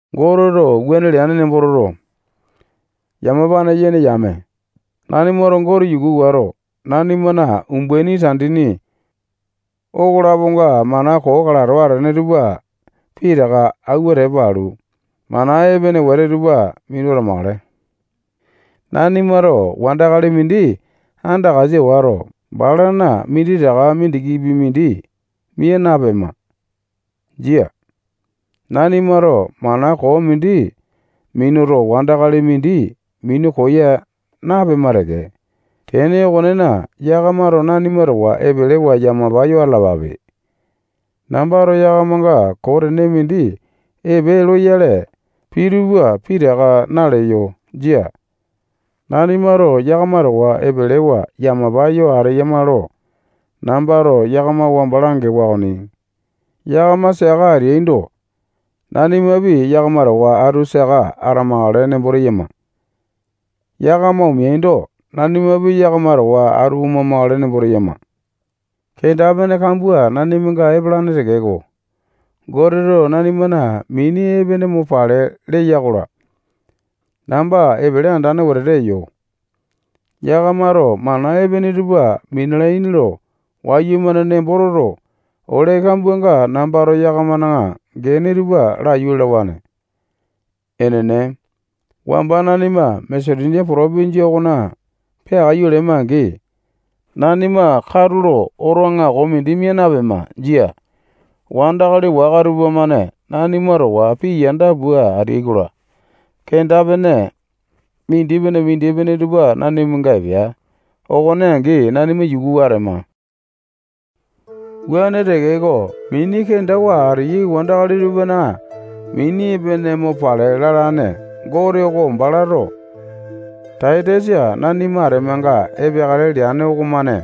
Goteto wuane leane nembo toto, yamapane yene yame, nanimato Gote yuku wato, nanimana umbaini tandini okolaponga mana koo kalato atene tupa pitaka awua tepa alu, mana epene wete tupa minu atamakale. Nanimato wandakali mindi andakasa wato, balana minditaka mindikipi mindi mia napema. Jia. Nanimato mana koo mindi minuto, wandakali mindi minu koya napema teke. Tene okonena, yakamato nanima towa epelewa yamapa yo atalapape. Nambato yakamanga koo tene mindi epe loyale pii utupa pitaka naleyo. Jia. Nanimato yakama towa epelewa yamapa yo ateyama lo nambato yakama wamba langewa okoni. Yakama saka ateaindo, nanimapi yakama towa atu saka atamakale nembo teyama. Yakama omeaindo, nanimapi yakama towa atu oma-makale nembo teyama. Kenda-pene kambua nanimanga epalane tekeko, Goteto nanimana mini epene mo pale leya-kola, namba epele andane wetete eyo. Yakamato mana epene tupa minalaini lo wayumane nembo toto, ole kambuanga nambato yakamana gene tupa laiyu lalawane. Enene, wamba nanima Masetonia potopinjia okona peakaiyu lema-angi, nanima katulo oto aŋako mindi mia napema. Jia. Wandakali waka tupamane nanima towa pii yanda pua ateai-kola, kenda-pene mindipene-mindipene tupa nanimanga epea. Okone angi nanima yukuwa atema. Wuane tekeko, mini kendawa ateyai wandakali tupana mini epene mo pale lalane Gote oko balato Taitasa nanima atemanga epeakale leane okomane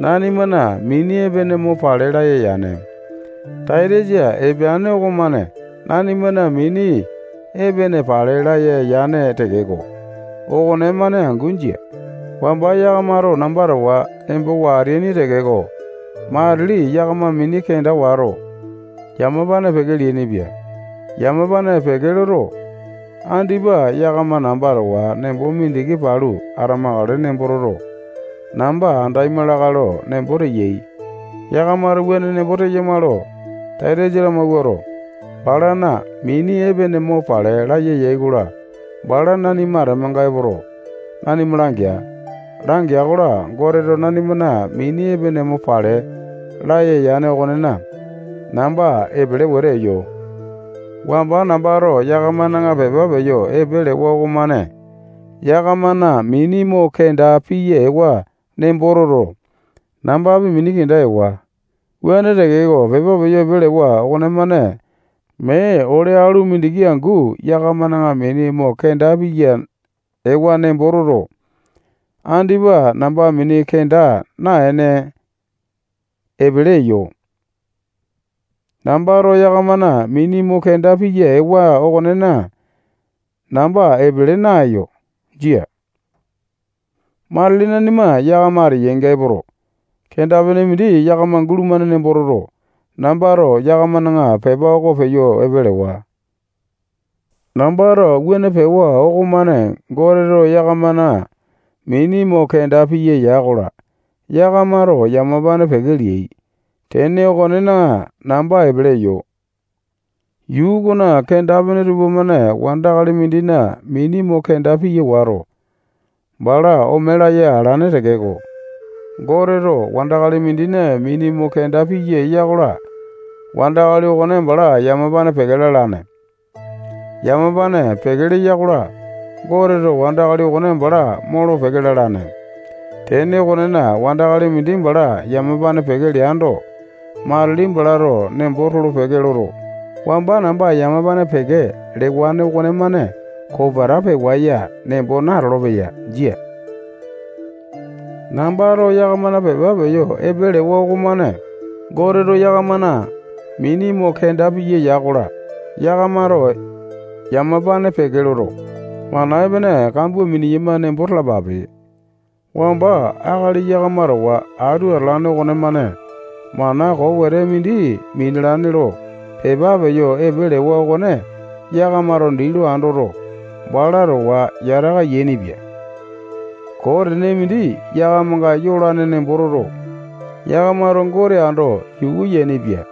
nanimana mini epene mo pale laya yane. Taitasa epeane okomane nanimana mini epene pale laya yane tekeko, okonemane angu jia. Wamba yakamato namba towa embowa ateaini tekeko, matili yakama mini kenda wato, yamapane peke leainipia. Yamapane peke loto, andipa yakama namba towa nembo mindiki palu atamakale nembo toto, namba andaima lakae lo nembo teyai. Yakamato wuane nembo teyama lo Taitasa lamawuato, balana mini epene mo pale laya yai-kola, bala nanima atemanga epoto, nanima langea. Langea-kola, Goteto nanimana mini epene mo pale laya yane okonena, namba epele wete eyo. Wamba nambato yakamana pepa peyo epe lewa okomane yakamana mini mo kenda piya ewa nembo toto, nambapi mini kenda ewa. Wuane tekeko, pepa peyo epe lewa okonemane mee ole alu mindiki angu yakamana mini mo kenda piya ewa nembo toto, andipa namba mini kenda naene, epele eyo. Nambato yakamana mini mo kenda piya ewa okonena, namba epele naeyo. Jia. Matili nanima yakama ateyainga epoto, kenda-pene mindi yakama gulumane nembo toto, nambato yakamana pepa okone peyo epe lewa. Nambato wuane pewa okomane Goteto yakamana mini mo kenda piya ya-kola, yakamato yamapane peke leai. Tene okonena, namba epele eyo. Yuu okona kenda-pene tupamane wandakali mindina mini mo kenda piya wato, bala ome laya alane tekeko, Goteto wandakali mindina mini mo kenda piya eya-kola, wandakali okone bala yamapane peke lalane. Yamapane peke leya-kola, Goteto wandakali okone bala molo-peke lalane. Tene okonena, wandakali mindi bala yamapane peke leando, matili balato nembo tolo-peke loto, wamba namba yamapane peke lewane okonemane kopeta pewa nembo natolo-peya. Jia. Nambato yakamana pepa peyo epe lewa okomane Goteto yakamana mini mo kenda piya ya-kola, yakamato yamapane peke loto, mana epene kambua miniyama nembo talapape. Wamba akali yakama towa atu atalane okonemane mana koo wete mindi minalane lo pepa peyo epe lewa okone yakamato dii lo andoto, bala towa yataka yainipia. Koo tene mindi yakamanga yolane nembo toto, yakamato Gote ando yuku yainipia.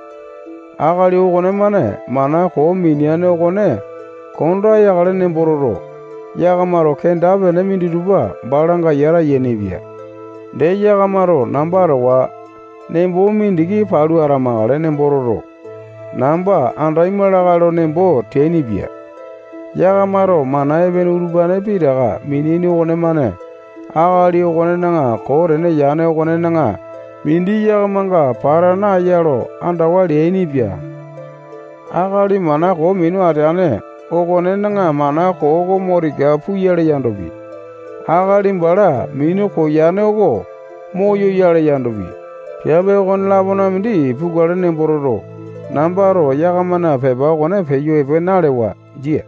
Akali okonemane mana koo mineane okone konda yakale nembo toto, yakamato kenda-pene minditupa balanga yata yainipia. Dee, yakamato namba towa nembo mindiki palu atamakale nembo toto, namba andaima lakae lo nembo teainipia. Yakamato mana epene utupane pitaka mineaini okonemane akali okonena koo tene yane okonena mindi yakamanga pata naeya lo andawa leainipia. Akali mana koo minu ateane okonena mana koo oko mo tika puyale yandopi, akali bala minu koyane oko moyoyale yandopi, piape okone-lapona mindi pukale nembo toto, nambato yakamana pepa okone peyo epe nalewa. Jia.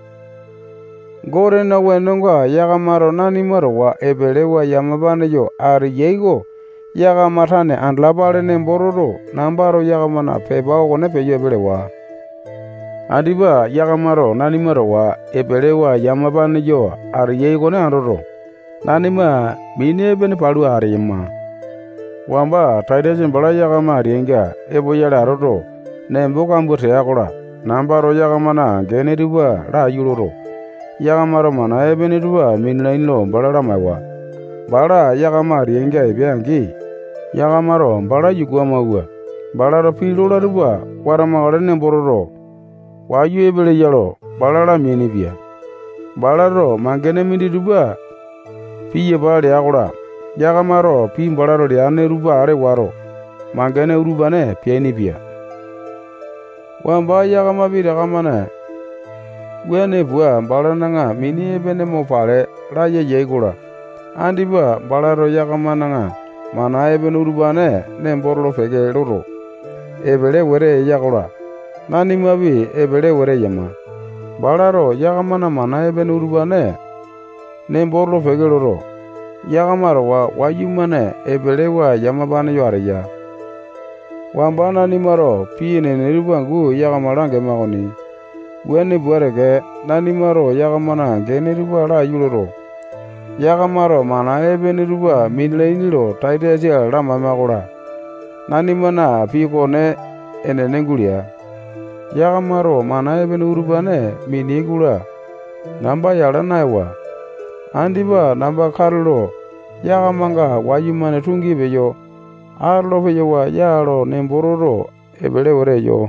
Gotena wenonga yakamato nanima towa epelewa yamapane yo ateyai oko yakama tane andalapale nembo toto, nambato yakamana pepa okone peyo epe lewa. Andipa yakamato nanima towa epelewa yamapane yo ateyai okone andoto, nanima mini epene palu ateyama. Wamba Taitasa bala yakama ateyainga epoyale atoto, nembo kambua tea-kola, nambato yakamana gene tupa laiyu loto, yakamato mana epene tupa minalaini lo bala lamaewa. Bala yakama ateainga epea-angi, yakamato bala yuku amawua, balato pii lola tupa watamakale nembo toto, wayu epeleya lo, bala lameainipia. Balato mangene minditupa piyapa lea-kola, yakamato pii balato leane tupa ale wato, mangene utupane peainipia. Wamba yakama pitaka-mane wuane pua, balana mini epene mo pale laya yai-kola, andipa balato yakamana mana epene utupane nembo tolo-peke loto, epele wete eya-kola, nanimapi epele wete eyama. Balato yakamana mana epene utupane nembo tolo-peke loto, yakama towa wayumane epelewa yamapane yo ateya. Wamba nanimato pii enene tupa angu yakama langema okoni. Wuane pua teke, nanimato yakamana gene tupa laiyu loto, yakamato mana epene tupa minalaini lo Taitasa lamaema-kola, nanimana pii okone enene gulea. Yakamato mana epene utupane mineai-kola, namba yala naewa. Andipa namba katulo yakamanga wayumane tungi peyo atolo-peyawa ya lo nembo toto, epele wete eyo.